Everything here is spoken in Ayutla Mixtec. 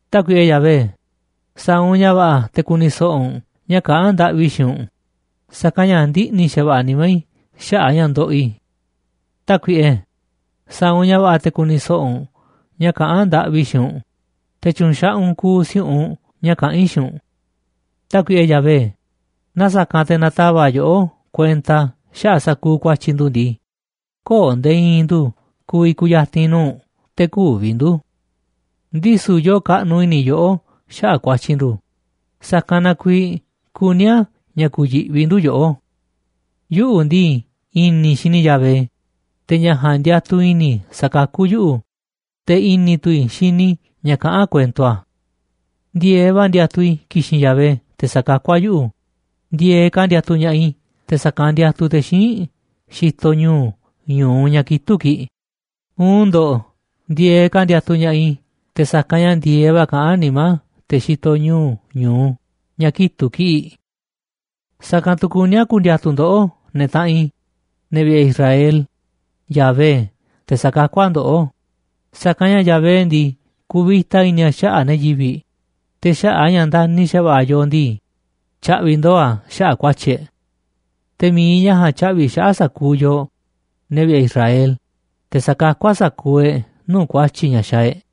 Tákuiꞌe Yahvé, sa̱a̱ u̱nꞌ ña̱ va̱ꞌa̱ te̱ ku̱ni̱ so̱ꞌo̱ u̱nꞌ ña̱ kaꞌán ndaꞌvi i̱ xiinꞌ u̱nꞌ, sa̱kanꞌ ña̱ ndiꞌni̱ xa̱va̱ꞌa̱ nimá i̱ xaꞌa̱ꞌ ña̱ ndoꞌoꞌ i̱. Tákuiꞌe, sa̱a̱ u̱nꞌ ña̱ va̱ꞌa̱ te̱ ku̱ni̱ so̱ꞌo̱ u̱nꞌ ña̱ kaꞌán ndaꞌvi i̱ xiinꞌ u̱nꞌ, te̱ tyu̱u̱n xaꞌanꞌ u̱nꞌ kuuꞌ si̱u̱ꞌunꞌ ña̱ kaꞌán i̱ xiinꞌ u̱nꞌ. Tákuiꞌe Yahvé, naaꞌ sa̱kanꞌ te̱ na̱tava̱ꞌ yoꞌó kuenta xaꞌa̱ꞌ sa̱kuuꞌ ku̱a̱tyi̱ ndu̱ ndii, köo̱ꞌ nde̱e̱ i̱i̱n ndu̱ ku̱vi̱ ku̱ya̱ti̱n nuu̱ꞌ u̱nꞌ, te̱ kü̱vi̱ ndu̱. Ndisu̱ yoo kaꞌnuꞌ i̱ni̱ yoꞌó xaꞌa̱ꞌ ku̱a̱tyi̱ ndu̱, sa̱kanꞌ na kuiiꞌ kuní a̱ ña̱ ku̱yi̱ꞌvi ndu̱ yoꞌó. Yuꞌu̱ ndii, i̱ni̱ i̱ xini i̱ Yahvé, te̱ ña̱ ja̱a̱nꞌ ndiatuꞌ i̱ni̱ i̱ sa̱kakú yuꞌu̱, te̱ i̱ni̱ tu̱ i̱ xini i̱ ña̱ kaꞌán kuento a̱. Ndi̱e̱eꞌ va̱ ndiatuꞌ i̱ ki̱xi̱n Yahvé te̱ sa̱kakú a̱ yuꞌu̱, ndi̱e̱eꞌ ka̱ ndiatuꞌ ña̱ꞌaꞌ i̱ te̱ sa̱kanꞌ ndiatuꞌ te̱ xíinꞌ xitoꞌ ñu̱u̱ ñu̱u ña̱ kitu̱ꞌ kiꞌi̱ꞌ, uun ndo̱ꞌ, ndi̱e̱eꞌ ka̱ ndiatuꞌ ña̱ꞌaꞌ i̱ te̱ sa̱kanꞌ ña̱ ndi̱e̱eꞌ va̱ kaꞌán nimá te̱ xitoꞌ ñu̱u̱ ñu̱u ña̱ kitu̱ꞌ kiꞌi̱ꞌ. Sa̱kanꞌ tu̱ kuní a̱ ku̱ndi̱a̱tu̱ ndoꞌó, ne̱ taꞌanꞌ i̱, ne̱ vi̱ꞌe̱ Israel, Yahvé, te̱ sa̱kakú a̱ ndoꞌó, sa̱kanꞌ ña̱ Yahvé ndii, kuvita i̱ni̱ a̱ xaꞌa̱ꞌ ne̱ yivi̱ꞌ, te̱ xaꞌa̱ꞌ a̱ ña̱ ndani̱ xa̱va̱ꞌa̱ a̱ yooꞌ ndii, tya̱ꞌvi̱ ndo̱o̱ a̱ xaꞌa̱ꞌ ku̱a̱tyi̱ e̱ꞌ. Te̱ mi̱iꞌ ña̱ ja̱a̱nꞌ tya̱ꞌvi̱ xaꞌa̱ꞌ sa̱kuuꞌ yooꞌ, ne̱ vi̱ꞌe̱ Israel, te̱ sa̱kakú a̱ sa̱kuuꞌ e̱ꞌ nuu̱ꞌ ku̱a̱tyi̱ ña̱ xaaꞌ e̱ꞌ.